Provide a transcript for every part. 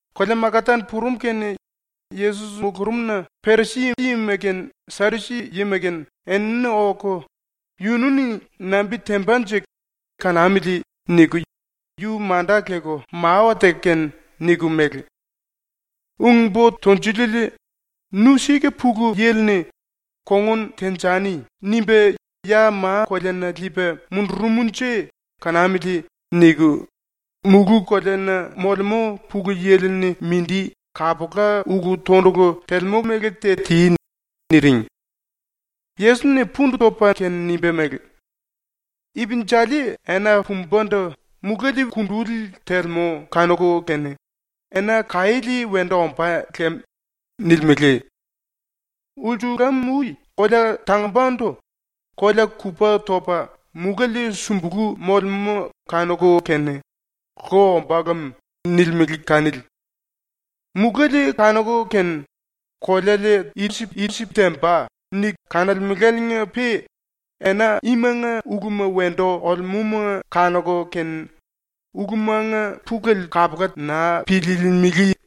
⸤Kolea Makatan purum⸥ kene Yesos mulurumna Perisi-yima kene Sadusi-yima kene enini oku, ‘Yunu-ni nambi tembanje? Kanamili.’ niku yu manda leku mawa teku kene niku mele: “Ung-Bo Tunjuliele, ‘Nu sika Pulu Yili-ni ‘Kongun tenjani.’ nimba ya ma-koleana liipa mundurumnje kanamili.’ niku mulú-koleana molemú Pulu Yili-ni mindi kapula ulu-tondulu telemú mele te ti.” niring. Yesos-ni pundu topa kene nimba mele: “Ipinjali ena pumbandu muléle kunduli telemú kanuku kene “Ena kaiéle wendu ombá lem.” nilimele. Ulsulam-ui kolea tangumbandu kolea kupa topa muléle sumbulú molemú kanuku kene “Lo ombá lem.” nilimele kanili. Muléle kanuku kene ‘koleale i-temba.’ niku kanolemeláliinga-pe ena imanga uluma wendu olemúma kanuku kene ulumanga pulele kapula naa piliilimili.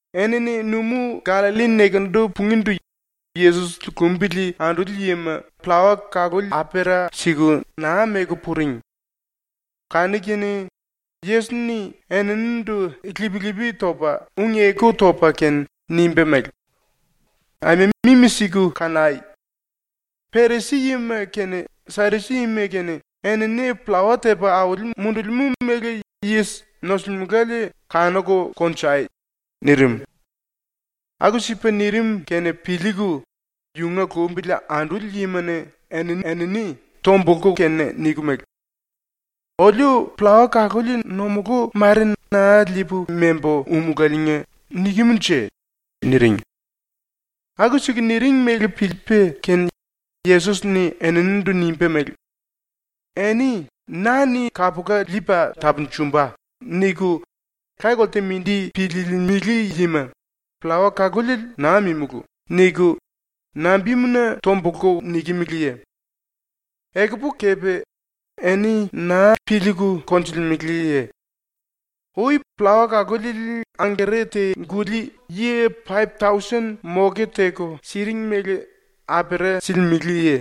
Enini ⸤Numú-Gallalli⸥ nekendu pungíndu ⸤Yesos⸥ lumbili anduli yima pllawa kaluli apera siku naa meku puring. Kanu-kene Yesos-ni eninindu ⸤lip-lipi topa ung-eku topa kene⸥ nimba mele: “Aima mimi-siku kanai! Perisi-yima kene Sadusi-yima kene enini pllawa tepa auli mundulimú méle yis nosulimelale kanuku konjai!” nirim. Aku-sipa nirim kene piliiku yunga lumbili anduli yima-ni eni-enini tombulku kene niku mele: “Oliu pllawa kaluli ⸤nomulú⸥ mare naa liipu membu úmulaliinga nikem-nje.” niring. Aku-siku niring mele piliipa kene Yesos-ni eninindu nimba mele: “Eni ‘na-ni kapula liipa tapunjumba.’ niku laye-kolte mindi piliilimili yima, “Pllawa kaluli naa mímulu.” niku nambimuna tombulku nikimiliye? Ekupu kepe eni naa piliiku konjulemeleye? Ui pllawa kaluli angere te-guli yi paip-tausen moke teku siring mele apera silimeleye?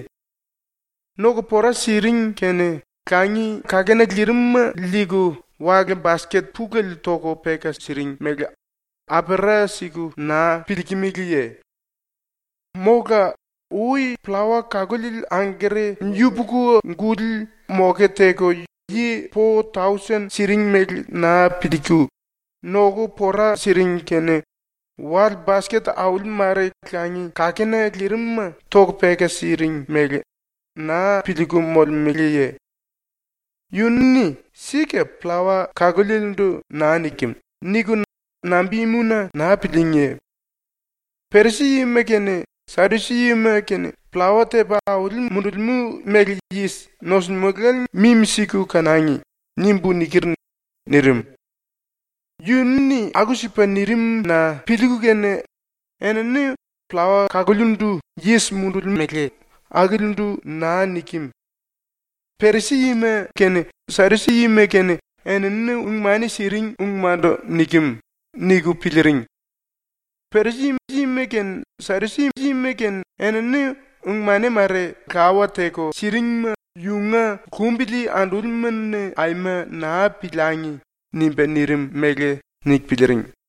⸤Noku pora siring kene⸥ langi kakena lirim-ma liiku wale-basket pulele toku peka siring mele apera siku naa piliikimiliye? “Mola ui pllawa kaluli angere yupuku-guli moke teku yi po-tausen siring mele naa piliiku, ⸤noku pora siring kene⸥ wale-basket auli mare langi kakena lirim-ma toku peka siring mele naa piliiku molemeleye? ‘Yunu-ni sika pllawa kalúlielendu naa nikem.’ niku nambimuna naa pilííngiye? ‘Perisi-yima kene Sadusi-yima kene pllawa tepa auli mundulimú méle yis nosulimelale mimi-siku kanangi.’ nimbu niker.” nirim. Yunu-ni aku-sipa nirim-na piliiku kene enini ‘Pllawa kalungíndu yis mundulimele akilindu naa nikem. Perisi-yima kene Sadusi-yima kene enini ung-mani siring ungmandu nikem.’ niku piliiring. ⸤‘erisi-yima kene Sadusi-yima kene enini ung-mani mare lawa teku siringma yunga lumbili andúlima-ni aima naa piliangi!’ nimba nirim mele niku piliiring.⸥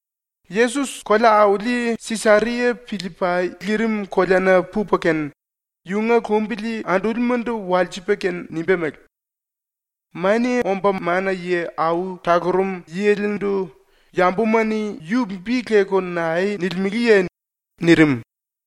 Yesos kolea-auli Sisaria-Pillipai lirim koleana pupa kene, yunga lumbili andúlimandu walsipa kene nimba mele: “Mania Omba Mana-Yi Au Talurum Yilindu yambuma-ni yu bi leku nae nilimeleye?” nirim.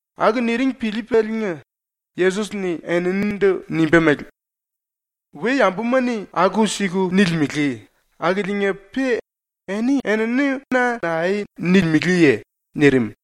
Aku niring piliipaliinga Yesos-ni eninindu nimba mele: “⸤We-yambuma-ni aku-siku nilimele⸥ akiliinga-pe eni-enini na nae nilimeleye?” nirim.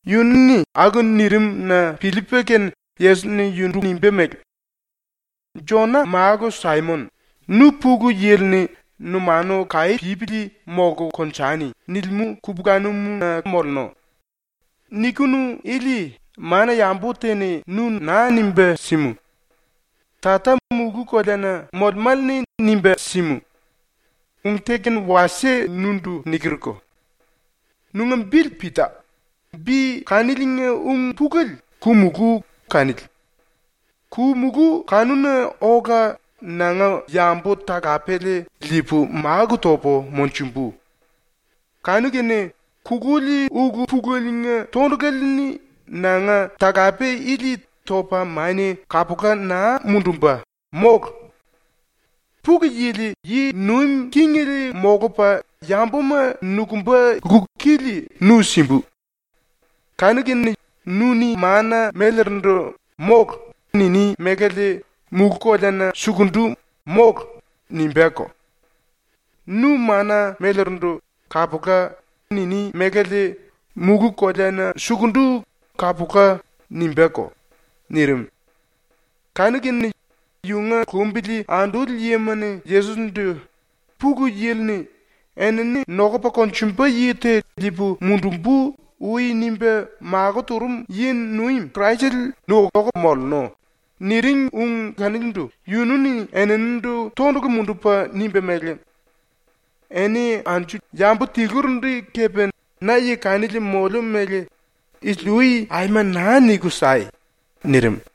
Yunu-ni aku nirim-na piliipa kene Yesos-ni yundu nimba mele: “Jona Málu Saimon, nu Pulu Yili-ni “Numanu kaí pípili molku konjani.” nilimú kupulanum-na mollu. Nikinu ili mana-yambu te-ni nu naa nimba símu. Tata mulú-koleana molemále-ni nimba símu. Ung te kene wasie nundu nikerko: Nunga bili Pita, (bi kaniliinga ung-pulele ‘ku-mulú’ kanili). Ku-mulú kanuna ola nanga yambu-talapele liipu máku topu monjumbu. Kanu-kene kululi ulu-pulelenga tondulale-ni nanga talape ili topa mania kapula naa mundumba, mólu. Pulu Yili yi nuim kingele molupa yambuma nokumba lku-kili nu simbu. Kanu-kene nu-ni mana-mélerindu “Mólu.” niní mélale mulú-koleana sukundu “Mólu.” nimbáko. Nu mana-mélerindu “Kapula.” niní mélale mulú-koleana sukundu “Kapula.” nimbáko.” nirim. Kanu-kene yunga lumbili anduli yima-ni Yesos-ndu “Pulu Yili-ni “Enini nokupa konjumba yi te liipu mundumbu.” ui nimba makó turum yi-nuim Kraisele nu oku mollu.” niring ung kanilindu yunu-ni eninindu tondulu mundupa nimba mele: “Eni anju-yambu tilurindu kepe na yi kanili moliu mele ⸤isili-ui⸥ aima naa niku sai!” nirim.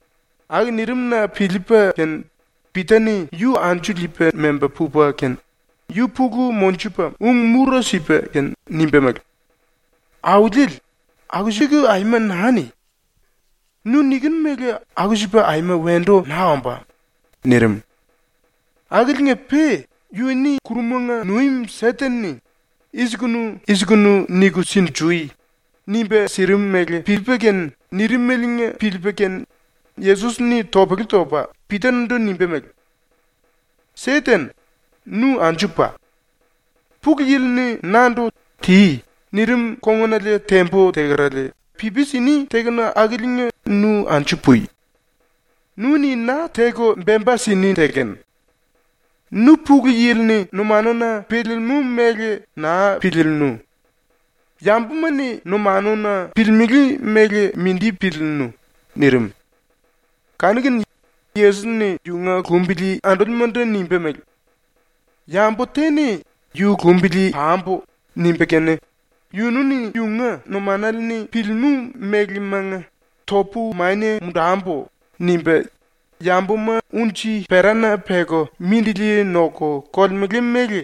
⸤Aku nirim-na piliipa kene⸥ Pita-ni yu anju liipa memba pupa kene yu pulu monjupa ung-mura sipa kene nimba mele: “Auliele, aku-siku aima naa ni! Nu nikinu mele aku-sipa aima wendu naa ombá.” nirim. Akiliinga-pe ⸤yu-ni kurumanga nuim Seten-ni “I-sikunu i-sikunu niku sinjui.” nimba sirim mele piliipa kene nirimeliinga piliipa kene⸥ Yesos-ni topele topa Pita-ndu nimba mele: “Seten, nu anju pa! Pulu Yili-ni nandu “Ti.” nirim kongunale tembu tekerale pipi sini tekenu akiliinga nu anju pui! Nu-ni na teku bemba sini tekenu. Nu Pulu Yili-ni numanuna piliilimú mele naa piliillu. Yambuma-ni numanuna piliilimili mele mindi piliillu.” nirim. Kanu-kene Yesos-ni yunga lumbili andúlimandu nimba mele: “Yambu te-ni ‘Yu lumbili pambu.’ nimba kene yunu-ni yunga numanale-ni piliilimú mélemanga ‘Topu mania mundambu.’ nimba yambuma unji-perana peku mindili noku kolemele mele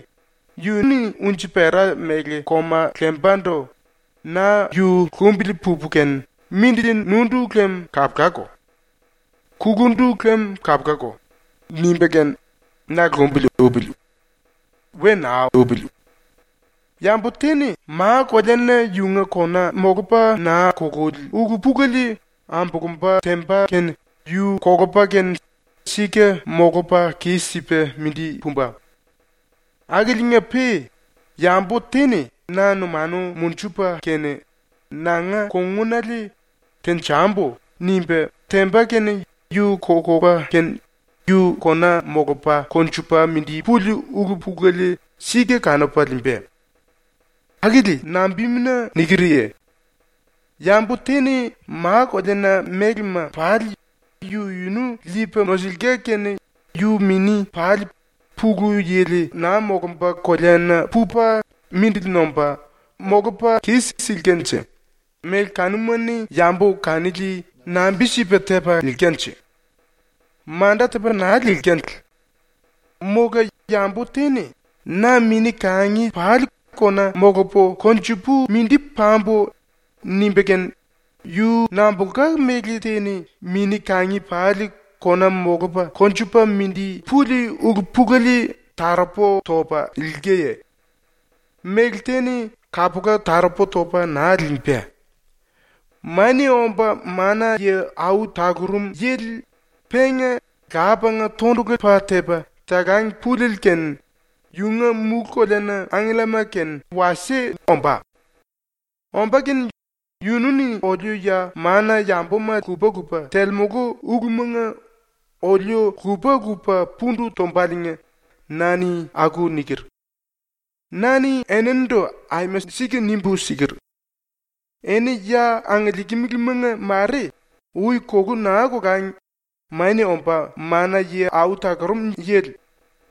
yu-ni unji-pera mele koma lembandu ‘Na yu lumbili pupu kene mindili nundu lem kapulako; kulundu lem kapulako.’ nimba kene na lumbili upili. We naa upili. Yambu te-ni ma-koleana yunga kona molupa naa kululi ulu-pulele ambulumba temba kene yu kolupa kene sika molupa kis-sipa mindi pumba. Akiliinga-pe yambu te-ni na numanu monjupa kene nanga kongunale “Tenjambu.” nimba temba kene yu kolupa kene yu kona molupa konjupa mindi puli ulu-pulele sika kanupa liimba. ⸤Akili nambimuna nikerye?⸥ Yambu te-ni ma-koleana mélema pali yu-yunu liipa nosulka kene yu mini pali Pulu Yili naa molumba koleana pupa mindili nomba molupa kis-silkanje méle kanuma-ni yambu kanili nambi-sipa tepa liilkanje? Manda tepa naa liilkale. Mola yambu te-ni ‘Na mini-kangi pali kona molupu konjupu mindi pambu.’ nimba kene yu nambulka méle te-ni mini-kangi pali kona molupa konjupa mindi puli ulu-pulele taropu topa liilkaye? Méle te-ni kapula taropu topa naa liimba. “Mania Omba Mana-Yi Au Talurum Yili penga Lapanga tondulu pa tepa talang puliele kene yunga ⸤mulú-koleana⸥ angkellama kene wasie ombá. Omba kene yunu-ni oliu ya mana-yambuma lupa-lupa telemulu ulumanga oliu lupa-lupa pundu tombaliinga na-ni aku niker. “Na-ni enindu aima sika nimbu siker: “Eni ya angiliikimilimanga mare ui kulú naa kolangi Mania Omba Mana-Yi Au Talurum Yili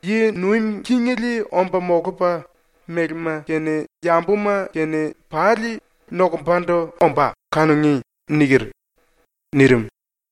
yi nuim kingele omba molupa mélema kene yambuma kene pali nokumbandu ombá kanungí.” niker.” nirim.